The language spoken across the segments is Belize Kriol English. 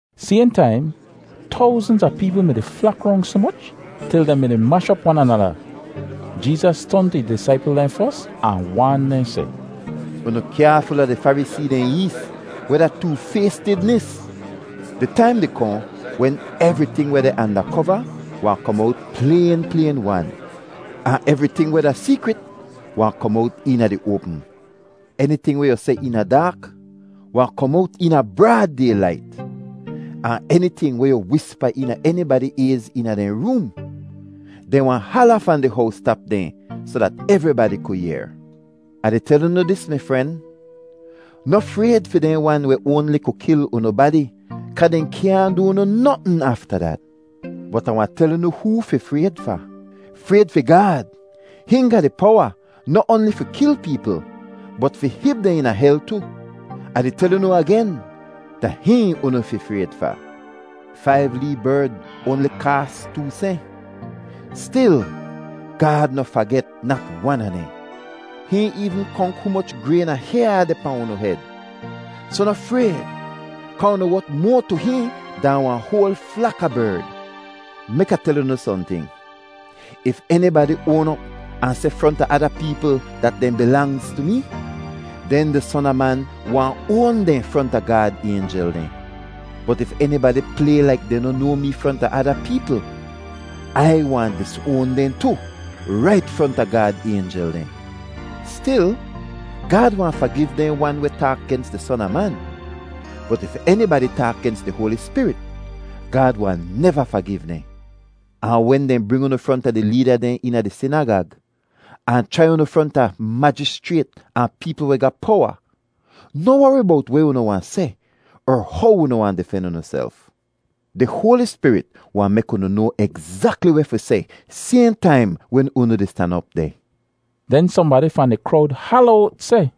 Sayhn taim, towznz a peepl mi-di flak rong soh moch til dehn mi-di mash op wan anada. Jeezas ton tu ih disaipl dehn fos ahn waan dehn seh, “Unu kyaaful a di Farisee dehn ees, weh da toofaystidnis. Di taim di kohn wen evriting weh deh anda kova wahn kom owt playn playn-wan, ahn evriting weh da seekrit wahn kom owt eena di oapm. Eniting weh yu seh eena daak wahn kom owt eena braad daylait, ahn eniting weh yu wispa eena enibadi ayz eena dehn room, dehn wahn hala fahn di howstap dehn soh dat evribadi ku yehr. “Ah di tel unu dis mi fren, noh frayd fi dehn wan weh oanli ku kil unu badi kaa dehn kyaahn du unu notn afta dat. Bot Ah wahn tel unu hoo fi frayd fa. Frayd fi Gaad! Hihn ga di powa noh oanli fi kil peepl bot fi hib dehn eena hel tu. Ah di tel unu agen, da hihn unu fi frayd fa. Faiv lee berd oanli kaas too sehn. Stil, Gaad noh faget nat wan a dehn. Hihn eevn konk humoch grayn a hyaa deh pahn unu hed. Soh noh frayd kaa unu wot moa tu hihn dahn wahn hoal flak a berd. “Mek Ah tel unu sohnting: if enibadi oan op ahn seh fronta ada peepl dat dehn bilangz tu mee, den di Son a Man wahn oan dehn fronta Gaad aynjel dehn! Bot if enibadi play laik dehn noh noa mee fronta ada peepl, Ai wahn disoan dehn tu, rait fronta Gaad aynjel dehn. Stil, Gaad wahn fagiv dehn wan weh taak gens di Son a Man, bot if enibadi taak gens di Hoali Spirit, Gaad wahn neva fagiv dehn. “Ahn wen dehn bring unu fronta di leeda dehn eena di sinagag, ahn chrai unu fronta majischrayt ahn peepl weh ga powa, noh wori bowt weh unu wahn seh er how unu wahn difen unuself. Di Hoali Spirit wahn mek unu noa egzakli weh fi seh sayhn taim wen unu di stan op deh.” Den sohnbadi fahn di krowd hala owt seh,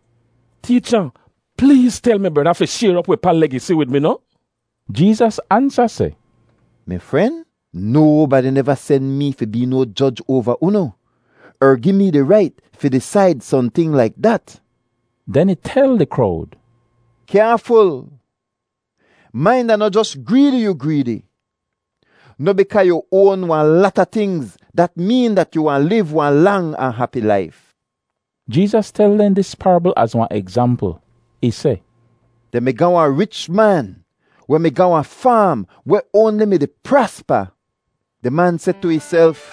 “Teecha, pleez tel mi breda fi shayr op wi pa legisi wid mi noh?” Jeezas ansa seh, “Mi fren, nobadi neva sen mee fi bee no joj oava unu er gi mee di rait fi disaid sohnting laik dat.” Den ih tel di krowd, “Kyaaful! Main dat da noh jos greedi yu greedi. Noh bikaa yu oan wahn lata tingz dat meen dat yu wahn liv wahn lang ahn hapi laif.” Jeezas tel dehn dis parabl az wahn egzampl. Ih seh, “Dehn mi ga wahn rich man weh mi ga wahn faam weh oanli mi-di praspa. Di man seh tu ihself,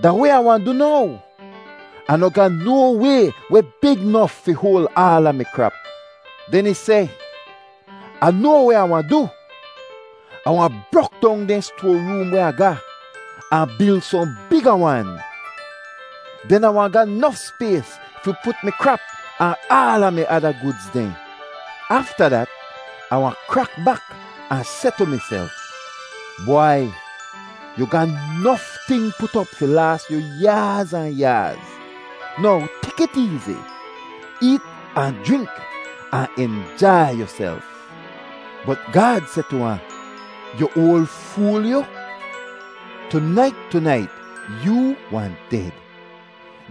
‘Da weh Ah wahn du now? Ah noh ga no way weh big nof fi hoal aala mi krap.’ “Den ih seh, ‘Ah noa weh Ah wahn du, Ah wahn brok dong dehn stoaroom weh Ah ga ahn bil sohn biga wan. Den Ah wahn ga nof spays fi put mi krap ahn aala mi ada gudz dehn. Afta dat, Ah wahn krak bak ahn seh tu miself, “Bwai, yu ga nof ting put op fi laas yu yaaz ahn yaaz! Now tek it eezi! Eet ahn jrink ahn injai yuself!”’ “Bot Gaad seh tu ahn, ‘Yu oal fool, yu! Tunait tunait yoo wahn ded.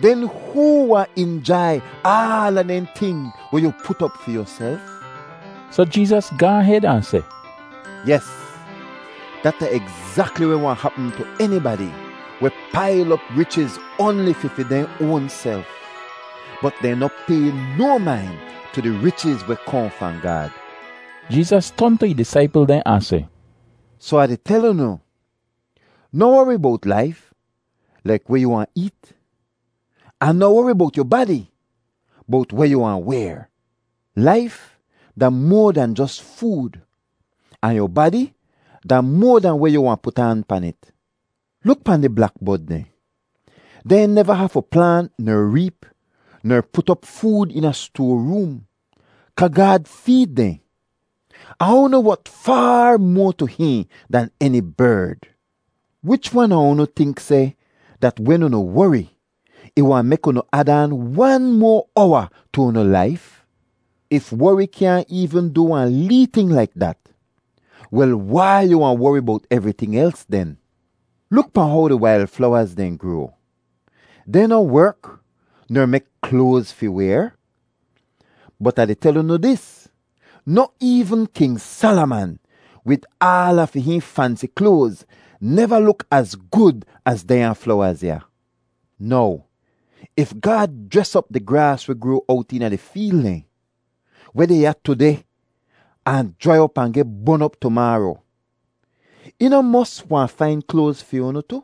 Den hoo wahn injai aala dehn ting weh yu put op fi yuself?’” Soh Jeezas gaahn hed ahn seh, “Yes, dat da egzakli weh wahn hapm tu enibadi weh pail op richiz oanli fi fi dehn oanself, bot dehn noh pay no main tu di richiz weh kohn fahn Gaad.” Jeezas ton tu ih disaipl dehn ahn seh, “Soh Ah di tel unu, noh wori bowt laif, laik weh yu wahn eet; ahn noh wori bowt yu badi, bowt weh yu wahn wayr. Laif da moa dahn jos food, ahn yu badi da moa dahn weh yu wahn put aan pan it. Luk pahn di blakbod dehn; dehn neva hafu plaant ner reep ner put op food eena stoaroom kaa Gaad feed dehn. Ahn unu wot faar moa tu hihn dahn eni berd! Wich wan a unu tink seh dat wen unu wori ih wahn mek unu ad aan wan moa owa tu unu laif? If wori kyaahn eevn du wahn lee ting laik dat, wel wai yu wahn wori bowt evriting els den? “Luk pahn how di wail flowaz dehn groa. Dehn noh werk ner mek kloaz fi wayr. Bot Ah di tel unu dis, noh eevn King Salaman, wid aala fi hihn fansi kloaz, neva luk az gud az dehnya flowaz ya. Now if Gaad jres op di graas weh groa owt eena di feel dehn, weh deh ya tudeh ahn jrai op ahn geh bon op tumaaro, ih noh mos wahn fain kloaz fi unu tu?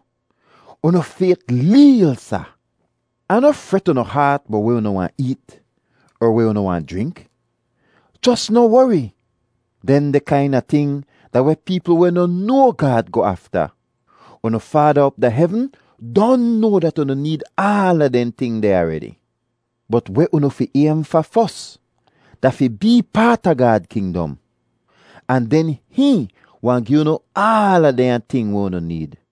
Unu fayt leel, sa! Ahn noh fret unu haat bowt weh unu wahn eet er weh unu wahn jrink; jos noh wori! Dehndeh kaina ting da weh peepl weh noh noa Gaad goh afta. Unu Faada op da hevn don noa dat unu need aala dehn ting deh aredi. Bot weh unu fi aym fa fos da fi bee paat a Gaad kingdom, ahn den hihn wahn gi unu aala dehnya ting weh unu need.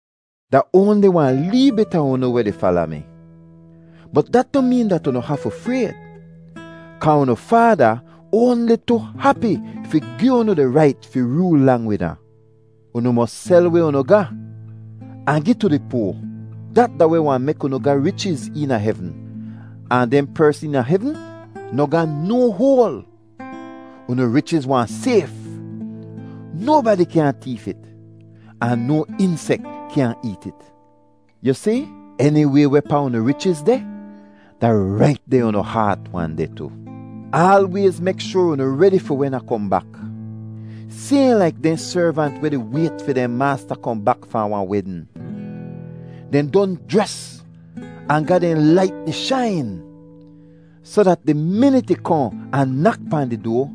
“Da oanli wahn lee bit a unu weh di fala mi, bot dat noh meen dat unu hafu frayd kaa unu Faada oanli tu hapi fi gi unu di rait fi rool lang wid ahn. Unu mos sel weh unu ga ahn gi tu di poa. Dat da weh wahn mek unu ga richiz eena hevn, ahn dehn pers eena hevn noh ga no hoal! Unu richiz wahn sayf; nobadi kyaahn teef it, ahn no insek kyaahn eet it. Yu si, eniway wehpaa unu richiz deh, da rait deh unu haat wahn deh tu. “Aalwayz mek shoar unu redi fi wen Ah kohn bak, sayhn laik dehn servant weh di wayt fi dehn maasta kohn bak fahn wahn wedn. Dehn don jres ahn ga dehn lait di shain, soh dat di minit ih kohn ahn nak pahn di doa,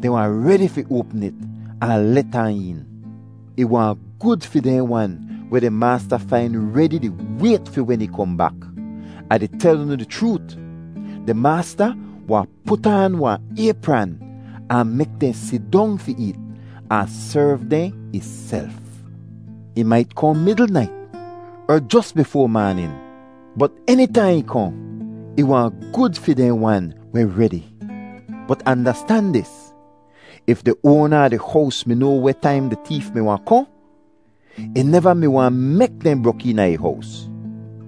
dehn wahn redi fi oapm it ahn let ahn een. Ih wahn gud fi dehn wan weh di maasta fain redi di wayt fi wen ih kohn bak. Ah di tel unu di chroot, di maasta wahn put aan wahn aypran ahn mek dehn sidong fi eet, ahn serv dehn ihself. Ih mait kohn midl nait, er jos bifoa maanin, bot enitaihn ih kohn, ih wahn gud fi dehn wan weh redi! Bot andastan dis: If di oana a di hows mi noa weh taim di teef mi wahn kohn, ih neva mi wahn mek dehn brok eena ih hows.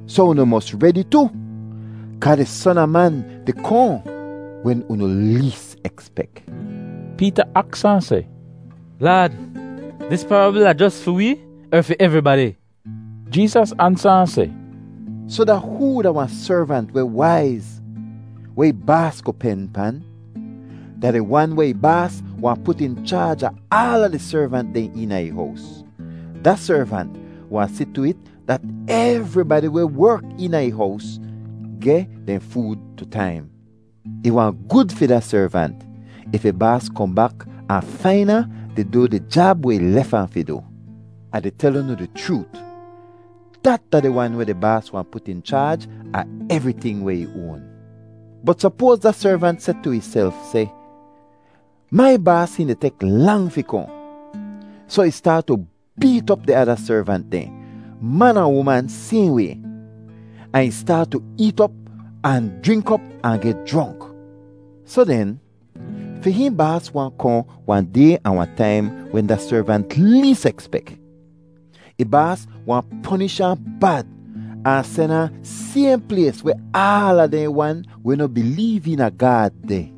Soh unu mos redi tu, kaa di Son a Man di kohn wen unu lees ekspek.” Peeta aks ahn seh, “Laad, dis parabl da jos fi wee er fi evribadi?” Jeezas ansa ahn seh, “Soh da hoo da wahn servant weh waiz, weh ih baas ku pen pan? Da di wan weh ih baas wahn put in chaaj a aala di servant dehn eena ih hows; da servant wahn si tu it dat evribadi weh werk eena ih hows geh dehn food tu taim. Ih wahn gud fi da servant if ih baas kohn bak ahn fain ahn di du di jab weh ih lef ahn fi du. Ah di tel unu di chroot, dat da di wan weh di baas wahn put in chaaj a evriting weh ih oan. “Bot sopoaz da servant seh tu ihself seh, ‘Mai baas hihn di tek lang fi kohn.’ Soh ih staat tu beet op di ada servant dehn, man ahn uman sayhn way, ahn ih staat tu eet op ahn jrink op ahn geh jronk. Soh den, fi hihn baas wahn kohn wahn day ahn wahn taim wen da servant lees ekspek. Ih baas wahn ponish ahn bad ahn sen ahn sayhn plays weh aala dehn wan weh noh bileev eena Gaad deh.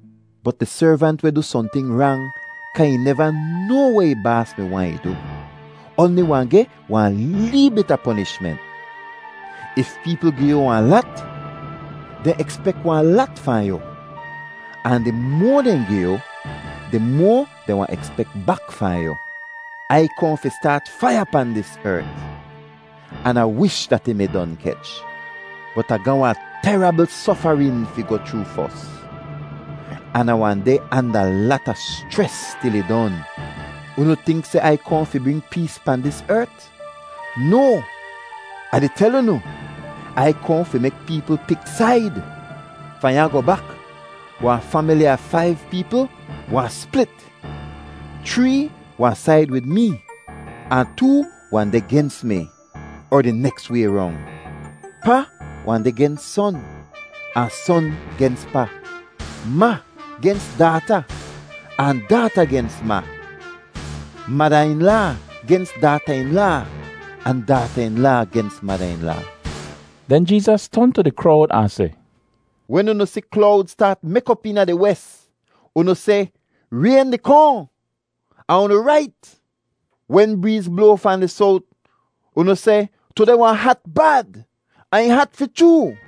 Bot di servant weh du sohnting rang kaa ih neva noa weh ih baas mi waahn ih du, oanli wahn geh wahn lee bit a ponishment. If peepl gi yu wahn lat, dehn ekspek wahn lat fahn yu, ahn di moa dehn gi yu, di moa dehn wahn ekspek bak fahn yu. “Ai kohn fi staat faiya pahn dis ert, an Ah wish dat ih mi don kech. Bot Ah ga wahn terabl sofarin fi goh chroo fos, an Ah wahn deh anda lata schres til ih don. Unu tink seh Ai kohn fi bring pees pahn dis ert? No, Ah di tel unu, Ai kohn fi mek peepl pik said. Fahn ya goh bak wahn famili a faiv peepl wahn split: chree wahn said wid mee, ahn too wahn deh gens mi—er di neks way rong. Pa wahn deh gens son ahn son gens pa; ma gens daata ahn daata gens ma, mada-in-laa gens daata-in-laa, ahn daata-in-laa gens mada-in-laa.” Den Jeezas ton tu di krowd ahn seh, “Wen unu si klowd staat mek op eena di wes, unu seh, ‘Rayn di kohn.’ Ahn unu rait. Wen breez bloa fahn di sowt, unu seh, ‘Tudeh wahn hat bad.’ Ahn ih hat fi chroo.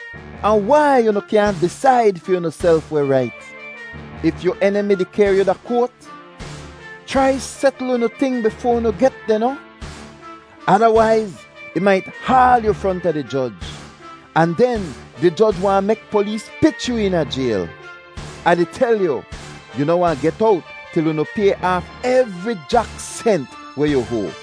“Ahn wai unu kyaahn disaid fi unuself weh rait? If yu enimi di kehr yu da koat, chrai setl unu ting bifoa unu get deh, noh; adawaiz ih mait haal yu fronta di joj, ahn den di joj wahn mek polees pich yu eena jayl. Ah di tel yu, yu noh wahn get owt til unu pay aaf evri jak sent weh yu hoa.”